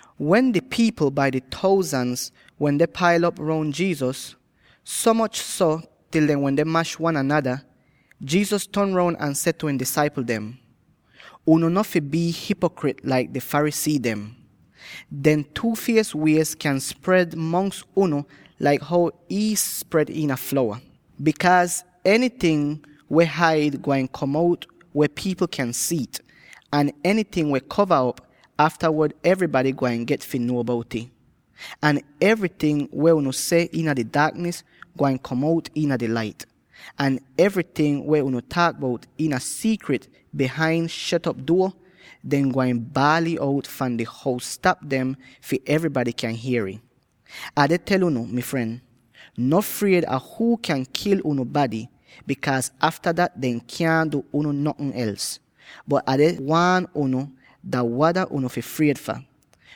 Wen di pipl bai di thousands wende pail op roun Jesus, so moch til dehn wende mash wan anada, Jesus ton roun ahn seh tu ihn disaipl dem, “Unu no fi bii hipokrit laik di Pharisee dem. Dehn two-fies wiez kyan spred mongs unu laik how iis spred iina flowa. Bikaaz enyting weh haid, gwain kom out weh pipl kyan si'it, ahn enyting weh kova op, aftawod evrybady gwain get fi nuo bout'ih. Ahn enyting weh unu seh iina di daaknis gwain kom out iina di lait. Ahn evryting weh unu taak bout iina siikrit bihain shet op duo, dehn gwain baal'ih out fahn di hous-tap dem fi evrybady kyan hier'ih. “Ah deh tel unu, mi fren: no fried a huu kyan kil unu bady, bikaaz afta dat dehn kyaahn du unu notn els. Bot Ah deh waan unu dah wada unu fi fried fah: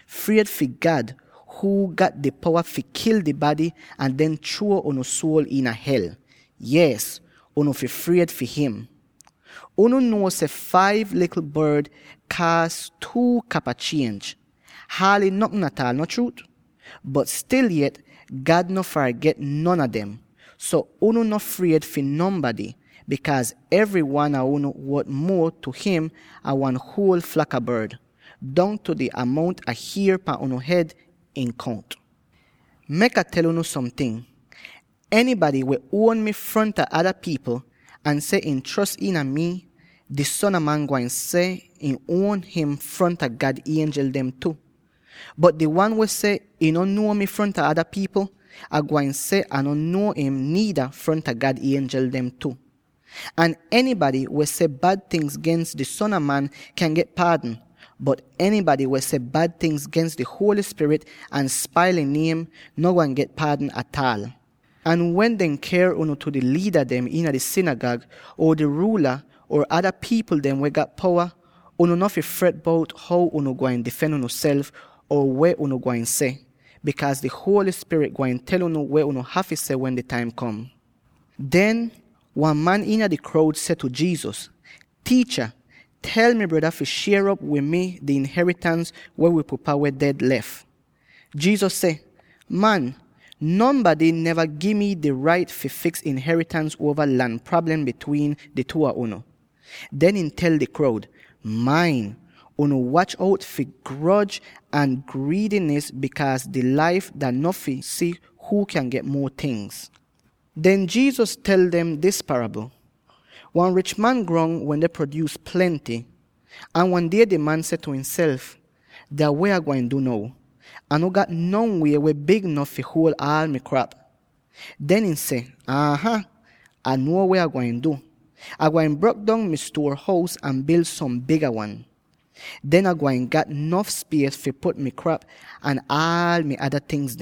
fried fi God huu gat di powa fi kil di bady ahn den chruo unu suol iina hel. Yees, unu fi fried fi him! “Unu nuo seh five likl bord kaas two kapa chienj —haaly notn ataal, no chruut? Bot stil yet, God no farget non a dem! So unu no fried fi nonbady, bikaaz evry wan a unu wot muo tu him an wan huol flak a bord. Dongtu di amount a hier pan unu hed ihn kount! “Mek Ah tel unu somting: enybady weh uon mi fronta ada pipl ahn seh ihn chros iina mi, di Son a Man gwain seh ihn uon him fronta God ienjel dem tu. Bot di wan weh seh ihn no nuo mi fronta ada pipl, Ai gwain seh Ah no nuo im niida fronta God ienjel dem tu. “Ahn enybady weh seh bad tingz gens di Son a Man kyan get paadn, bot enybady weh seh bad tingz gens di Holy Spirit ahn spail ihn niem, no gwain get paadn ataal. “Ahn wen dehn ker unu tu di liida dem iina di sinigag, or di ruula or ada pipl dem weh gat powa, unu no fi fret bout how unu gwain difen unuself, or weh unu gwain seh, bikaaz di Holy Spirit gwain tel unu weh unu hafy seh wen di taim kom.” Den, wan man iina di kroud seh tu Jesus, “Tiicha, tel mi breda fi shier op wid mi di inheritans weh wi pupa weh ded lef.” Jesus seh, “Man, nonbady neva gi mi di rait fi fiks inheritans uova lan prablem bitwiin di two a unu.” Den ihn tel di kroud, “Main; unu watch out fi groj ahn griidinis, bikaaz dis laif dah no fi si huu kyan get muo tingz.” Den Jesus tel dem dis parabl: “Wan rich man grong wende prodyuus plenty. Ahn wan die, di man seh tu ihnself, ‘Dah weh Ah gwain du now? Ah no gat non wie weh big nof fi huol aal mi krap.’ Den ihn seh, ‘Aa-haah, Ah nuo weh Ah gwain du: Ah gwain brok dong mi stuor-hous ahn bil som biga wan. Den Ah gwain gat nof spies fi put mi krap ahn aal mi ada tingz.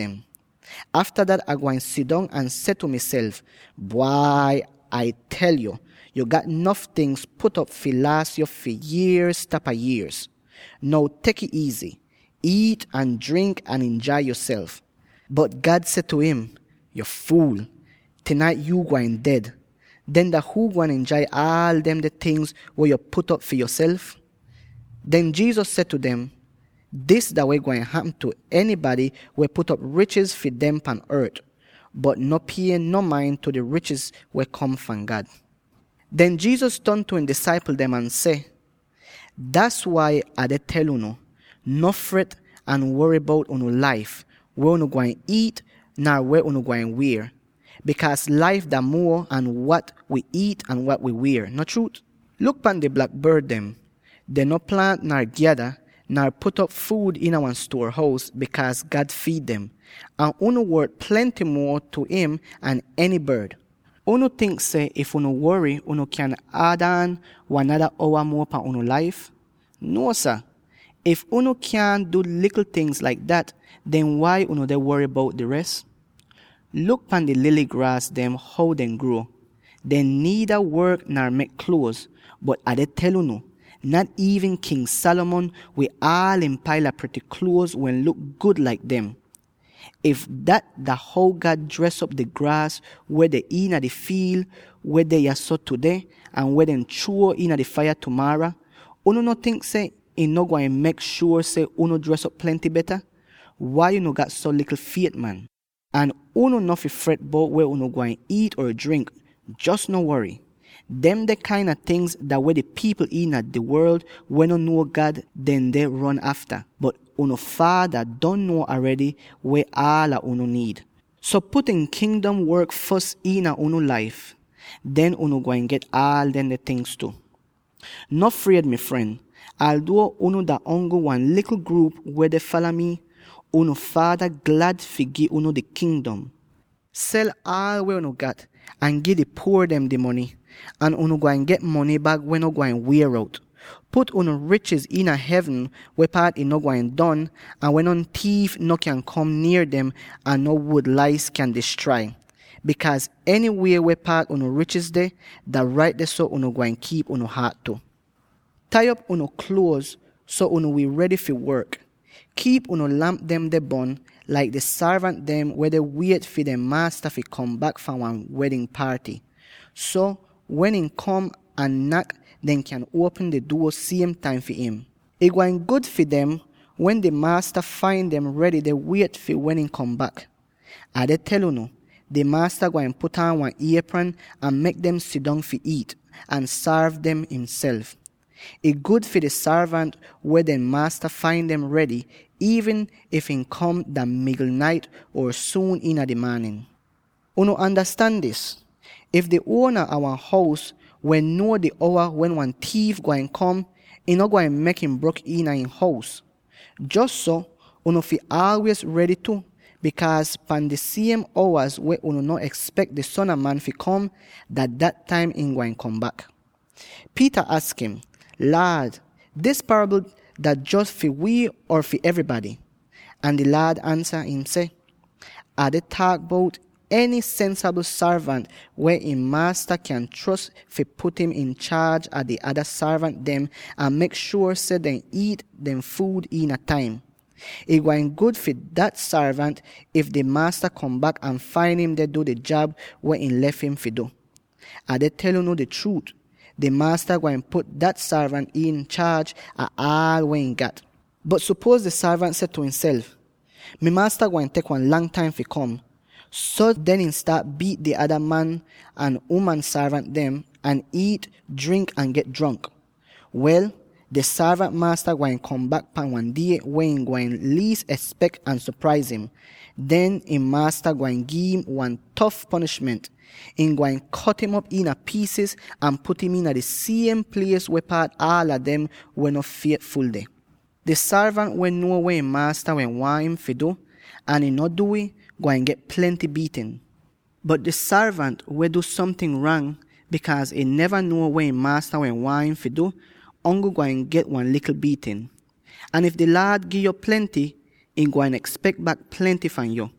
Afta dat Ah gwain sidong ahn seh tu miself, “Bwai, Ai tel yo; yo gat nof tingz put'op fi laas yo fi yierz tapa yierz! Now tek'ih iizy; iit ahn drink ahn injai yoself!” ’ Bot God seh tu im, ‘Yo fuul yo! Tinait yuu gwain ded. Den dah huu gwain injai aal demde tingz weh yo put'op fi yoself?’” Den Jesus seh tu dem, “Dis dah weh gwain hapm tu enybady weh put'op richiz fi demself pan ort, bot no pie no main tu di richiz weh kom fahn God.” Den Jesus ton tu ihn disaipl dem ahn seh, “Das wai Ah deh tel unu: no fret ahn wory bout unu laif, weh unu gwain iit, nar weh unu gwain wier; bikaaz laif dah muo an wat wi iit ahn wat wi wier, no chruut? Luk pan di blak bord dem: dehn no plaant nar gyada, nar put'op fuud iina wan stuor-hous, bikaaz God fiid dem. Ahn unu wot plenty muo tu im an eny bord! Unu tink seh if unu wory, unu kyan ad aan wan nada owa muo pan unu laif? Nuo, sah! If unu kyaahn du likl tingz laik dat, den wai unu deh wory bout di res? Luk pan di lily graas dem how dehn gruo. Dehn niida work nar mek kluoz; bot, Ah deh tel unu: nat iivn King Solomon, wid aal ihn paila prity kluoz wehn luk gud laik dem. If dat dah how God dres op di graas weh deh iina di fiil, weh deh yahso tudeh, ahn weh dehn chruo iina di faiya tumaara, unu no tink seh ihn no gwain mek shuor seh unu dres op plenty beta? Wai unu gat so likl fiet, man! “Ahn unu no fi fret bout weh unu gwain iit or drink —jos no wory! Demde kain a tingz dah weh di pipl iina di worl, weh no nuo God, dehn deh ron afta. Bot unu Faada don nuo aredy weh aala unu niid. So put ihn Kingdom work fos iina unu laif; den unu gwain get aal demde tingz tu. “No fried, mi fren; alduo unu dah ongl wan likl gruup weh deh fala mi, unu Faada glad fi gi unu di Kingdom. Sel aal weh unu gat ahn gi di puor dem di mony, ahn unu gwain get mony bag weh no gwain wier out. Put unu richiz iina hevn weh paat ih no gwain don, ahn weh non tiif kyaahn kom nier dem ahn non wud-lais kyaahn distrai niida, bikaaz enywie weh paat unu richiz deh, dah rait dehso unu gwain kiip unu haat tu. “Tai op unu kluoz so unu wi redy fi work. Kiip unu lamp dem deh bon, laik di sorvant dem weh deh wiet fi dehn maasta fi kom bak fahn wan wedn paaty. So, wen ihn kom ahn nak, dehn kyan uopm di duo siem taim fi im. Ih gwain gud fi dem, wen di maasta fain dem redy deh wiet fi wen ihn kom bak. Ah deh tel unu: di maasta gwain put aan wan iepran ahn mek dem sidong fi iit, ahn sorv dem ihnself. Ih gud fi di sorvant wen dehn maasta fain dem redy, iivn if ihn kom dah migl nait or suun iina di maanin. “Unu andastan dis: if di uona a wan hous wehn nuo di owa wen wan tiif gwain kom, ihn no gwain mek im brok iina ihn hous. Jos so, unu fi aalwiez redy tu, bikaaz pahn di siem owaz weh unu no espek di Son a Man fi kom, dah dat taim ihn gwain kom bak.” Peter aks im, “Laad, dis parabl dah jos fi wii or fi evrybady?” Ahn di Laad ansa im seh, “Ah deh taak bout eny sensabl sorvant weh ihn maasta kyan chros fi put im inchaaj a di ada sorvant dem ahn mek shuor seh dehn iit dehn fuud iin taim. Ih gwain gud fi dah sorvant, if di maasta kom bak ahn fain im deh du di jab weh ihn lef im fi du! Ah deh tel unu di chruut: di maasta gwain put dah sorvant inchaaj ah aal weh ihn gat. Bot sopuoz di sorvant seh tu ihnself, ‘Mi maasta gwain tek wan lang taim fi kom.’ So den, ihn staat biit di ada man ahn uman sorvant dem, ahn iit, drink ahn get jronk. Wel, di sorvant maasta gwain kom bak pahn wan die weh ihn gwain liis espek ahn sopraiz im. Den, ihn maasta gwain gi'im wan tof ponishment: ihn gwain kot'im op iina piisiz ahn put im iina di siem plies weh paat aala dem weh no fietful deh. “Di sorvant weh nuo weh ihn maasta wehn waahn im fi du, ahn ihn no du'ih, gwain get plenty biitn. Bot di sorvant weh du somting rang, bikaaz ihn neva nuo weh ihn maasta wehn waahn ihn fi du, ongl gwain get wan likl biitn. Ahn if di Laad gi'yo plenty, ihn gwain espek bak plenty fahn yo,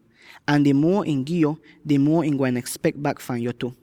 ahn di muo ihn gi'yo, di muo ihn gwain espek bak fahn yo tu.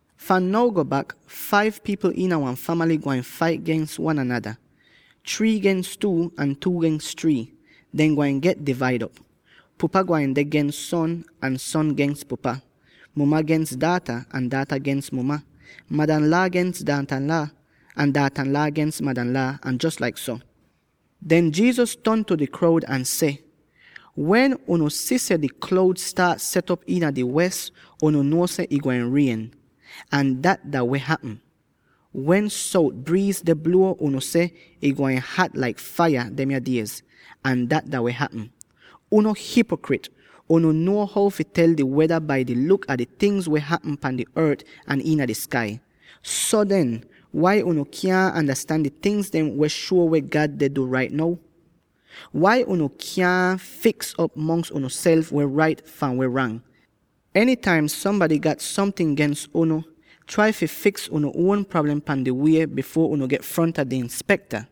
Fahn now go bak, five pipl iina wan famaly gwain fait gens wan anada, three gens two ahn two gens three. Dehn gwain get divaid op: Pupa gwain deh gens son, ahn son gens pupa; muma gens daata, ahn daata gens muma; madanlaa gens daatanlaa, ahn daatanlaa gens madanlaa, ahn jos laik so.” Den Jesus ton tu di kroud ahn seh, “Wen unu si seh di kloud staat set op iina di wes, unu nuo seh, ‘Ih gwain rien.’ Ahn dat dah weh hapm. Wen sout briiz deh bluo, unu seh, ‘Ih gwain hat laik faiya demya diez.’ Ahn dat dah weh hapm. Unu hipokrit! Unu nuo how fi tel di weda bai di luk a di tingz dem weh hapm pan di ort ahn iina di skai. So den, wai unu kyaahn andastan di tingz dem weh shuo weh God deh du rait now? “Wai unu kyaahn fiks'op mongs unuself weh rait fahn weh rang? Enytaim sombady gat somting gens unu, trai fi fiks unu uon prablem pan di wie, bifuor unu get fronta di inspekta;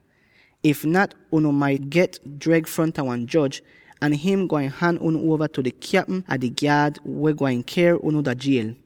if nat, unu maita get dreg fronta wan joj, ahn him gwain han unu uova tu di kyapm a di gyaad weh gwain ker unu dah jiel!